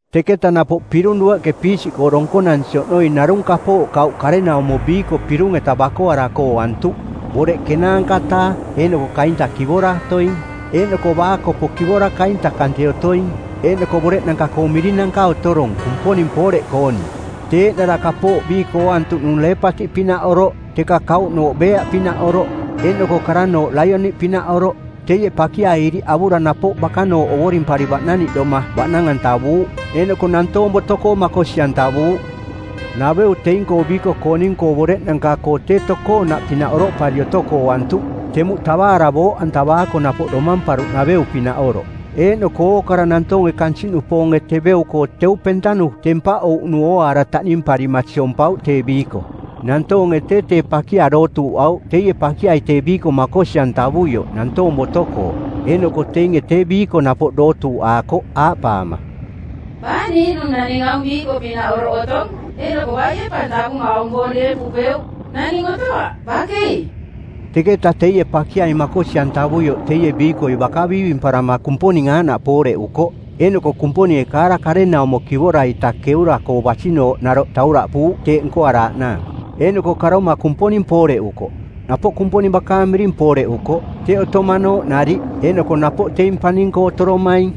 Teketa napoꞌ pirung dueꞌke piisiꞌkoo donkonansi oꞌnoi narung kapooꞌ kauꞌ karenaumo biiko pirung-eta bakoarako ooantuꞌ, boreꞌ ˜kenaanka-taa eeꞌnoko kainta kivora otoing, eeꞌnoko baakopo kivora kainta kante otoing eeꞌnoko boreꞌnanka-koo mirinanka otorong Kumponing pooreꞌkooning. Tee eeꞌnara kapooꞌ biiko ooantuꞌnung leepatiꞌpinaꞌoroꞌ, teka kauꞌnooꞌ beeaꞌpinaꞌoroꞌ, eeꞌnoko karannooꞌ laioni-pinaꞌoroꞌ. Teie pakiai iriꞌ avura napoꞌ bakanooꞌ ovorimpari baꞌnavaꞌnaniꞌdoma baꞌnang-antavuuꞌ. Eeꞌnoko nantoong boto-koo makosi-antavuuꞌ. Naveu teing-koo biiko-kooning-koo boreꞌnanka-koo tee tokoonaꞌpinaꞌ oroꞌpari otoko ooantuꞌ, temuꞌ tavaara booꞌantavaako napoꞌ domamparuꞌnaveu-pinaꞌ oroꞌ. Eeꞌnoko ookara nantoonge kansiꞌnupoonge teveu-koo teu pentanu tempaꞌouꞌnu ooaara taꞌnimparima siompauꞌ tee biiko. Nantoonge tee tee pakia dootuuꞌauꞌ teie pakiai tee biiko makosi-antavuioꞌ nantoong boto-koo, eeꞌnoko teinge tee biiko napoꞌ dootuuꞌaakooꞌ aaꞌpaama, “Baa niiꞌnung naning aung biiko-pinaꞌ oroꞌ otong, eeꞌnoko baie pa tavuma aung boong deempupeuꞌ? Naning otoaꞌ, bakei!” Teketa teie pakiai makosi-antavuioꞌ teie biikoi baka biivimparama Kumponing aaꞌnaꞌ pooreꞌukoꞌ. Eeꞌnoko Kumponinge kaara karenaumo kivora-ita keura-koo basinooꞌ naroꞌ tauraꞌpuuꞌ teeꞌ nkoaraaꞌnaang. Eeꞌnoko karoma Kumponing pooreꞌukoꞌ. Napoꞌ Kumponing bakaang miring pooreꞌukoꞌ, teꞌ otomanooꞌ nariꞌ, eeꞌnoko napoꞌ teing paning-koo otoromaing.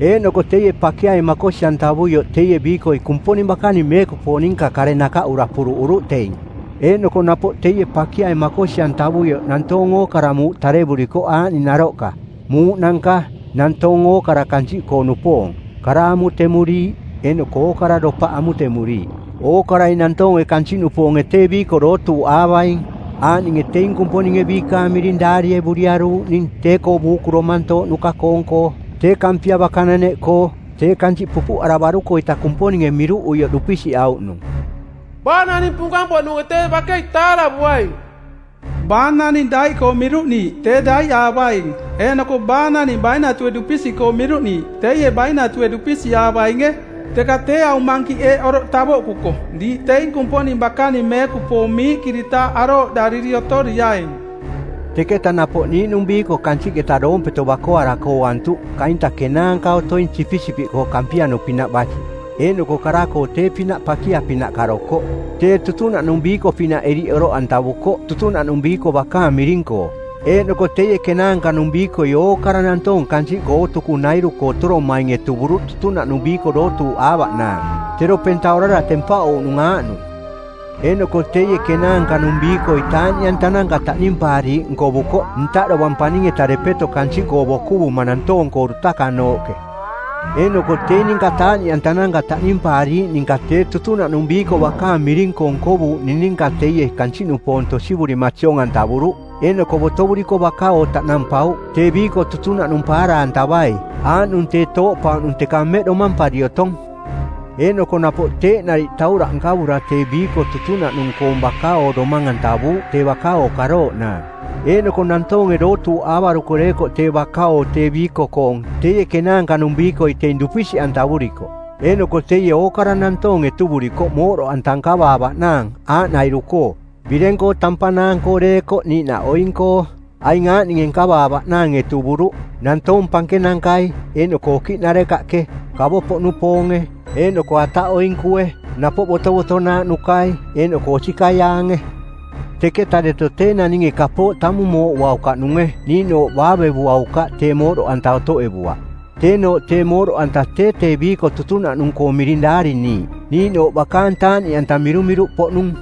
Eeꞌnoko teie pakiai makosi-antavuioꞌ teie biikoi Kumponing bakaning meekupoong ninka kare nakaꞌura puruꞌuruꞌ teing. Eeꞌnoko napoꞌ teie pakiai makosi-antavuioꞌ nantoong ookara muuꞌ tarevurikoꞌ aaꞌning naroꞌka: muuꞌnanka, nantoong ookara kansiꞌkoo-nupoong, kara amutemuriiꞌ, eeꞌnoko ookara dopaꞌ amutemuriiꞌ. Ookarai nantoonge kansiꞌnupoonge tee biiko dootuuꞌaavaing, aaꞌninge teing Kumponinge biikaang miring daarievuriaruuꞌning tee-koo Buuku Domantooꞌnuka-koong-koo, tee Kampia bakananeꞌkoo, tee kansiꞌ pupuꞌaravaruko-ita Kumponinge miruꞌuioꞌ dupisiꞌauꞌnung. Baa naning punkang-poꞌnunge tee bakei taaravuaing. Baa naning daiꞌkoo miruꞌniiꞌ tee daiꞌaavaing, eeꞌnoko baa naning bainatue dupisiꞌkoo miruꞌniiꞌ teie, bainatue dupisiꞌaavainge. Teka tee aung mankiꞌ eeꞌ oroꞌ tavoꞌkuko diiꞌ teing Kumponing bakaning meekupoong miiꞌkiritaaꞌ arooꞌdariri otoriaing. Teketa napoꞌ niiꞌnung biiko kansiꞌketa doompeto bakoarako ooantuꞌ kainta kenaanka otoing sipisipiꞌkoo kampianu-pinaꞌ basi, eeꞌnoko kara-koo tee-pinaꞌ pakia-pinaꞌ karokoꞌ. Tee tutunaꞌnung biiko-pinaꞌ iriꞌ oroꞌantavukoꞌ tutunaꞌnung biiko bakaang miring-koo, eeꞌnoko teie kenaanka-nung biikoi ookara nantoong kansiꞌkoo ootukunairu-koo otoromaing etuvuruꞌ tutunaꞌnung biiko dootuuꞌaavaꞌnaang, tero penta orara tempaꞌouꞌnung aaꞌnung. Eeꞌnoko teie kenaanka-nung biikoi taaꞌniꞌantananka taꞌnimpaariiꞌ nkovukoꞌ ntaꞌ dovang paning-eta depeto kansiꞌkoo bokuvuma nantoong-koo dutakanooꞌke. Eeꞌnoko teing ninka taaꞌniꞌantananka taꞌnimpaariiꞌ ninka tee tutunaꞌnung biiko bakaang miring-koo nkovuuꞌning ninka teie kansiꞌnupoong tosivurima siong-antavuruꞌ. Eeꞌnoko botovuriko baka-oo taꞌnampauꞌ tee biiko tutunaꞌnung paara-antavai, aaꞌnung tee tooꞌpauꞌnung teka mmeꞌ domampari otong. Eeꞌnoko napoꞌ teeꞌ nariꞌ tauraꞌ nkavura tee biiko tutunaꞌnung-koong baka-oo domang-antavuuꞌ tee baka-oo karooꞌnaang. Eeꞌnoko nantoonge dootuuꞌaavaruko deekoꞌ tee baka-oo tee biiko-koong teie kenaanka-nung biikoi teing dupisiꞌantavurikoꞌ. Eeꞌnoko teie ookara nantoong etuvurikoꞌ mooꞌdoꞌanta nkavaavaꞌnaang aaꞌnairu-koo: bireng-koo tampanaang-koo deekoꞌ niiꞌnaꞌ oing-koo. Aing aaꞌninge nkavaavaꞌnaang etuvuruꞌ: nantoong pankenankai eeꞌnoko okiꞌnarekaꞌke, kavo-poꞌnupoonge, eeꞌnoko ataꞌoinkue, napoꞌ botovotonaaꞌnukai eeꞌnoko osikaiaange. Teketa deto tee naninge kapooꞌ tamung mooꞌuaukaꞌnunge niiꞌnooꞌ baavevuaukaꞌ tee mooꞌdoꞌanta otoꞌevuaꞌ. Teenooꞌ tee mooꞌdoꞌanta tee tee biiko tutunaꞌnung-koong miring daariniiꞌ niiꞌnooꞌ bakaang taaꞌniꞌanta mirumiruꞌpoꞌnung.